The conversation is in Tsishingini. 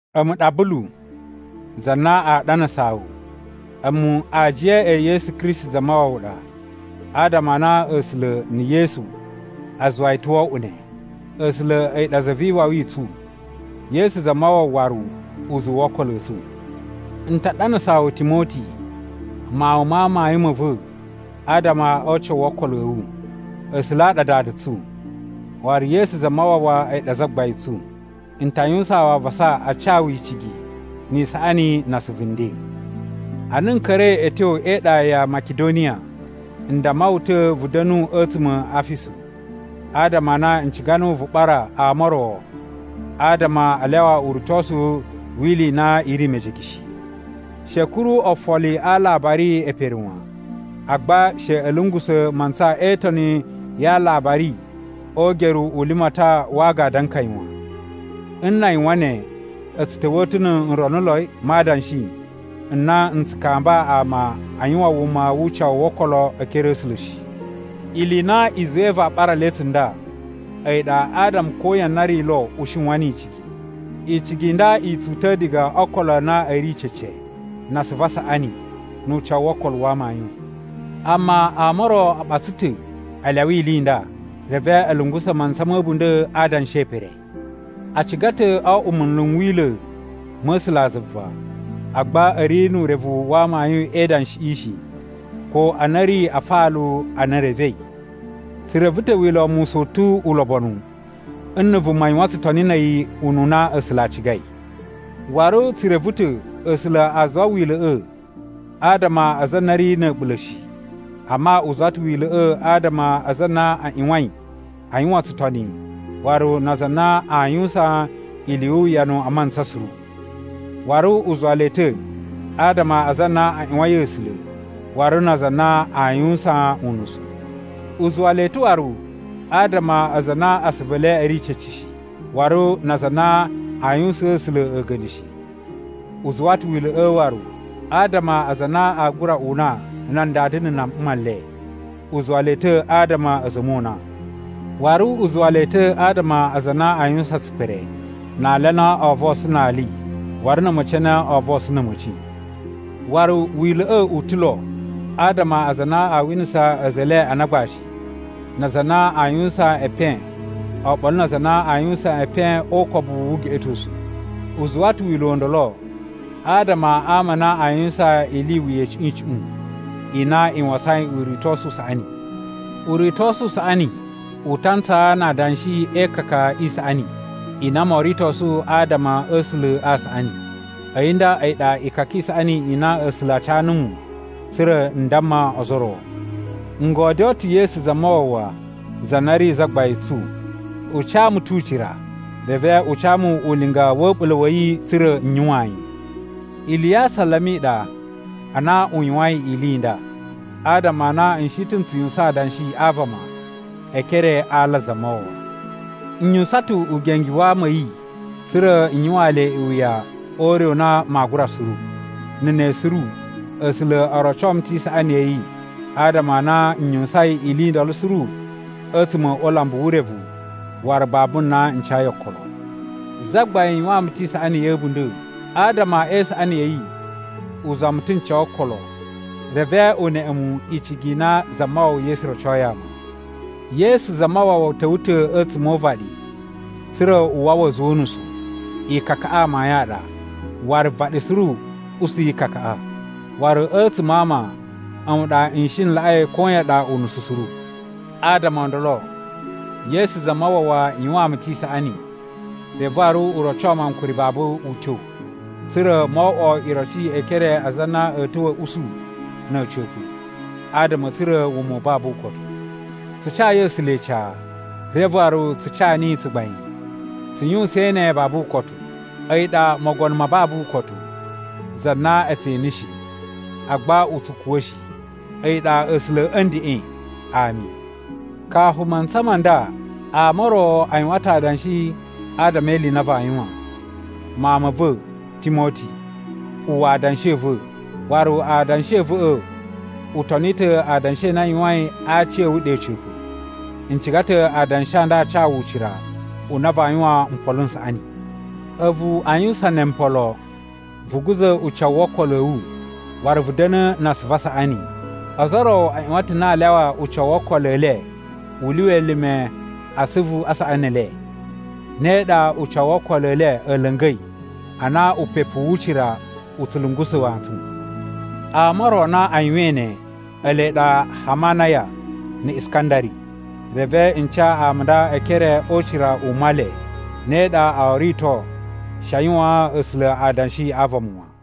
A̱mu ɗa Bulu, za na aa ɗanasaa wu. A̱mu aajiya e Yesu Kristi Zamawawa ɗa adama a na A̱sula̱ na̱ Yesu a zuwa yi ta̱ wo oꞌwo ne. A̱sula̱ a̱yi ɗa za vi iwawi i tsu. Yesu Zamawawa waru uzuwu wo okolo a̱ tsu. N ta ɗanasaa wu Timoti, mawun ma amayun ma̱ va̱ adama o ucawu wo okolo a̱ wu. A̱sula̱ a ɗa Dada tsu, waru Yesu Zamawawa a̱yi ɗa Zagbain tsu. N ta yuwusaan wu avasa a ca wu icigi ni isaꞌani na asuvu nden. Ana n ka̱ra̱i a̱ tyo e iɗa ya Makidoniya, n damma wu ta̱ vu da̱nu a̱tsuma̱ a Afisu. Adama a na n ciga nuwu vu ɓara ama o ro adama a lyawa uritosu wi ili i na i ri mejege shi. She a̱ kuru ofoli a alabari e pere wan, agba she a̱ lungusa̱ mantsa e itoni ya alabari o ugeru u limatan wa agadu a nkaya wan. Nna a yuwan ne a̱ tsu ta̱wa̱ ta̱ nu nronuloi ma adanshi n na n tsu kamba ama a yuwan wuma wu ucawu wo okolo e ekere a̱ A̱sula̱ shi. Ili i na i zuwai vaa ɓara le tsunda a̱yi ɗa adama koyan na ri lo u shiwan ni icigi. Icigi i nda i tsu uta̱ diga o okolo a na a̱ ri cece, na asuvu a saꞌani, nu ucawu wo okolo a amayun. Amma ama o ro a ɓatsa ta̱ a lyawa ili i nda. Reve a̱ lungusa̱ mantsa ma̱ a̱bunda̱ a adanshi e pere. A ciga ta̱ o oꞌwo munlu n Wila̱ ma̱ A̱sulazuva, agba a̱ ri nu urevu wa amayun e idanshiꞌi shi ko ana a̱ ri afalu a na e revei. Tsu reve ta̱ Wila̱ wa Musa u tu ulobonu nna̱ vuma yuwan tsutoni na̱ a̱yi ununa A̱sula̱ a cigai. Waru tsu reve ta̱ A̱sula̱ a zuwa Wila̱ꞌa̱ adama a aza a na a̱ ri na̱ a̱ɓula̱ shi. Amma u zuwa ta̱ Wila̱ꞌa̱ adama a aza a na a ꞌyuwain a yuwan tsutoni waru na aza a na aa yuwusan ili yu uwuyanu a mantsa suru. Waru u zuwa le ta̱ adama a aza a na a ꞌyuwain A̱sula̱ waru na aza a na aa yuwusan unusu. U zuwa le ta̱ waru adama a aza a na asuvu e le a̱ ri cece shi, waru na aza a na aa yuwusaan A̱sula̱ a̱ga̱nda̱ shi. U zuwa ta̱ Wila̱ꞌa̱ waru adama a aza a na aa gura una nan dada na̱ nan mma le. U zuwa le ta̱ adama a̱ a̱za̱ a̱ mona. Waru u zuwa le ta̱ adama a aza a na aa yuwusan tsipere, na ali a na oo vosun na ali waru na̱ a̱ma̱ci a na oo vosun na̱ a̱ma̱ci. Waru Wila̱ꞌa̱ u ta̱ lo adama a aza a na a winasa a̱za̱ e le ana agbashi, na aza a na a yuwusan epen oɓolo na aza a na a yuwusan epen o ukobu wu ugeꞌetosu. U zuwa ta̱ Wila̱ u ndolo adama a ama a na a yuwusan ili i wuya icuꞌun icuꞌun i na i wasain uritosu u saꞌani. Uritosu u saꞌani u ta ntsaa na adanshi e ikaka i saꞌani i na moo ritosu adama a̱ A̱sula̱ a saꞌani. A̱yi nda a̱yi ɗa ikaka i saꞌani i na A̱sula̱ a ca numu tsa̱ra̱ n damma ozo o ro. N godyoo ta̱ Yesu Zamawawa za na ri Zagbain tsu, u ca mu tu ucira. Reve u ca mu ulinga wa̱ a̱ɓula̱ wa̱ yi tsa̱ra̱ n yuwaan yi. Ili ya asalama i ɗa, a na u yuwain ili i nda, adama a na n shi ta̱ n tsu yuwusan adanshi a vama e ekere a ala a Zamawawa. N yuwusan ta̱ ugenge wa ama a̱ yi tsa̱ra̱ n yuwaan le iwuya o ure u na maa gura suru. Na̱ ne suru A̱sula̱ o roco mu ta̱ isaꞌani ya̱ yi adama a na n yuwusain ili i ndolo suru a̱tsuma̱ o ulambu wu urevu waru babu na n cayi okolo. Zagbain yuwaan mu ta̱ isaꞌani ya̱ a̱bunda̱. Adama e isaꞌani ya̱ yi u zuwa mu ta̱ n ca okolo, reve u neꞌe mu icigi i na Zamawawa Yesu rocoi ama. Yesu Zamawawa ta̱wa̱ ta̱ a̱tsuma̱ o uvaɗi tsa̱ra̱ u wawa a̱za̱ o unusu. Ikakaꞌa amayun a ɗa, waru vaɗi suru usu ikakaꞌa. Waru a̱tsuma̱ a ama, a̱mu ɗa n shi n laꞌai koyan ɗa unusu suru. Adama o ndolo, Yesu Zamawawa yuwaan mu ta̱ isaꞌani, reve waru u roco mu ankuri babu utyo, tsa̱ra̱ mo oꞌwo iroci e ekere a aza a na a̱a̱ ta̱wa̱ a̱ usu na̱ a̱ca̱pa̱ adama a̱ tsura̱ wuma u babu ukotu. Tsu cayi A̱sula̱ ica, reve waru tsu ca niyi tsugbain. Tsu yuwusain ne babu ukotu. A̱yi ɗa Mogono ma babu ukotu, za na a̱ tse ene shi, agba u tsu kuwa̱ shi. A̱yi ɗa A̱sula̱ a̱ ndeꞌen. Ami. Kafu mantsa ma nda, ama o ro a yuwan ta̱ adanshi adama e ili i na vaa yuwan. Mawun ma̱ va̱, Timoti, uwwa adanshi a̱ va̱, waru adanshi a̱ va̱ꞌa̱ u toni ta̱ adanshi a na a yuwain a aci a̱ wu ɗe a̱ca̱pa̱. N ciga ta̱ adanshi a nda a ca wu ucira u na vaa yuwan mpolo n saꞌani. A̱vu a yuwusan ne mpolo, vu guza̱ ucawu wo okolo a̱ wu waru vu da̱na̱ na asuvu a saꞌani. Ozo o ro a ꞌyuwan ta̱ na aa lyawa ucawu wo okolo e le u lyuwa elime a asuvu a saꞌani e le, ne ɗa ucawu wo okolo e le a̱ la̱nga̱i ana upepu wu ucira u tsu lungusa̱ wantsun. Ama o ro a na a yuwain ne, ele ɗa Hamanaya na̱ Iskandari. Reve n ca ama a nda e ekere o ucira u Male, ne ɗa oo rito she a yuwaan A̱sula̱ adanshi a vama wan.